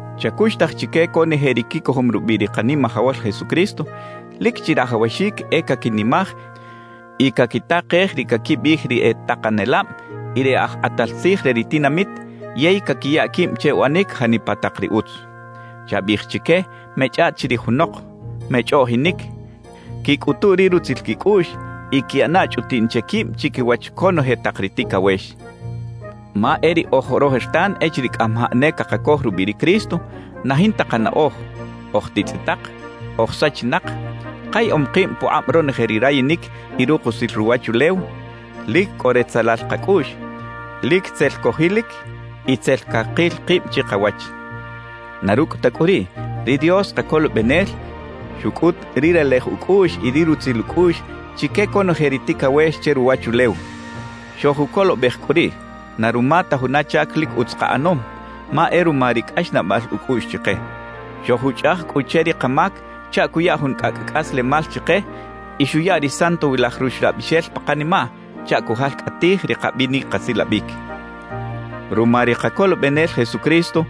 Chacuxtaj chique conoje ri quicojom rubiꞌ ri Kanimajawal Jesucristo, lic chirajawaxic e caquinimaj y caquitakej ri caquibiꞌij ri e takanelab y ri e aj kꞌatal tzij re ri tinamit yey caquiya quib che uꞌanic janipa tak ri utz. Chabiꞌij chique mechꞌaꞌt chirij junok, mechꞌoꞌjinic; quicꞌutu ri rutzil quicꞌuꞌx y quiꞌana chꞌutiꞌn che quib chiquiwach conoje tak ri ticawex. Ma e riꞌoj rojertan echiriꞌ cꞌamajaꞌ ne cakacoj rubiꞌ ri Cristo, na jinta kanaꞌoj, oj titzꞌitak, oj sachinak, kayaꞌom kib pukꞌab ronoje ri rayinic y rukusil ruwachulew, lic cꞌo retzelal kacꞌuꞌx, lic tzel cojilic y tzel cakil kib chikawach. Na rucꞌ ta cꞌu riꞌ, ri Dios Kacolobenel xucꞌut ri relej ucꞌuꞌx y ri rutzil ucꞌuꞌx chique conoje ri ticawex che ruwachulew. Xojucolobej cꞌu riꞌ, na ruma ta juna chac lic utz kaꞌanom, ma e ruma ri cꞌaxnaꞌbal ucꞌuꞌx chike. Xojuchꞌaj cꞌu che ri kamac chaꞌ cuya jun cꞌacꞌ cꞌaslemal chike y xuya ri Santowilaj Ruxlabixel pa kanimaꞌ chaꞌ cujalcꞌatij ri kabinic kasilabic. Ruma ri Kacolobenel Jesucristo,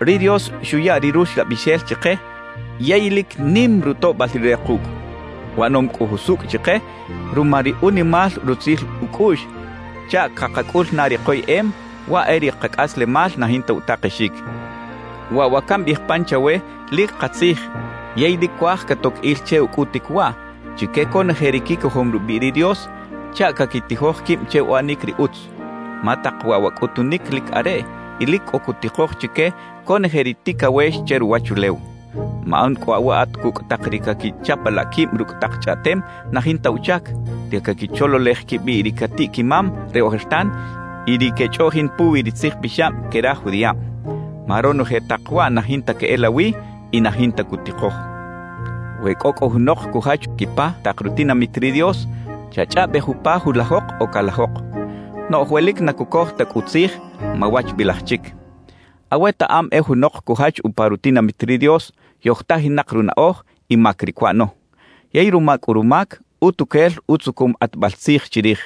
ri Dios xuya ri Ruxlabixel chike yey ¡lic nim rutoꞌbal Rire kucꞌ! Uꞌanom cꞌu jusucꞌ chike ruma ri unimal rutzil ucꞌuꞌx chaꞌ cakacꞌul na ri koyeꞌem, waꞌ e ri kacꞌaslemal na jinta utakexic. Waꞌ wa cambiꞌij pan chawe lic katzij yey lic cuaj catoc il che ucꞌutic waꞌ chique conoje ri quicojom rubiꞌ ri Dios chaꞌ caquitijoj quib che uꞌanic ri utz. Ma tak waꞌ wa cꞌutunic lic areꞌ y lic cꞌo cutikoj chique conoje ri ticawex che ruwachulew. Maꞌan cꞌu aweꞌat cucꞌ tak ri caquichapalaꞌ quib rucꞌ tak chꞌaꞌtem na jinta uchac, ri caquichololej quibiꞌ ri catiꞌ-quimam re ojertan y ri quechꞌoꞌjin puwi ri tzijpixab que ri aj judiꞌab. Ma ronoje tak waꞌ na jinta queꞌelawi y na jinta cutikoj. We cꞌo cꞌu junok cujach quipa tak rutinamit ri Dios, chachꞌaꞌbej upa julajok o calajok. Noꞌj we lic na cucoj ta cꞌu tzij, mawachbilaj chic. Awetaꞌam e junok cujach upa rutinamit ri Dios, yojtajinak runaꞌoj y mac ri cuꞌano. Yey ruma cꞌu rumac, utuquel utzucum kꞌatbal tzij chirij.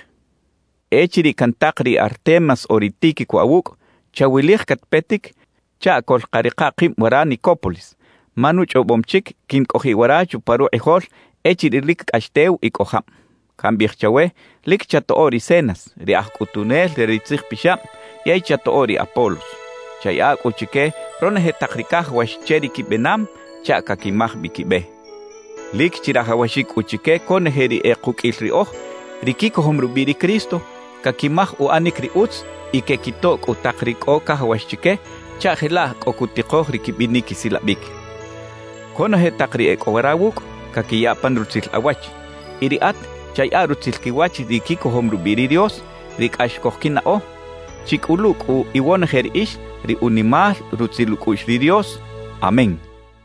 Echiriꞌ cantak ri Artemas o ri Tíquico awucꞌ, chawilij catpetic chaꞌ coꞌlkarika kib wara Nicópolis, ma nuchꞌobom chic quincꞌojiꞌ wara chupa rukꞌijol echiriꞌ lic cꞌax tew y cꞌo jab. Cambiꞌij chawe lic chatoꞌo ri Zenas, ri aj cꞌutunel re ri tzijpixab yey chatoꞌo ri Apolos. Chayaꞌa cꞌu chique ronoje tak ri cajawax che ri quibenam chaꞌ caquimaj bi quibe. Lic chirajawaxic cꞌu chique conoje ri e kuqꞌuil riꞌoj, ri quicojom rubiꞌ ri Cristo, caquimaj uꞌanic ri utz y quequitoꞌ cꞌu tak ri cꞌo cajawax chique chaꞌ jelaꞌ cꞌo cutikoj ri quibinic quisilabic. Conoje tak ri e cꞌo wara wucꞌ, caquiya pan rutzil awach. Y riꞌat chayaꞌa rutzil quiwach ri quicojom rubiꞌ ri Dios, ri cꞌax cojquinaꞌo. Chicꞌulu cꞌu iwonoje riꞌix ri unimal rutzil ucꞌuꞌx ri Dios. Amén.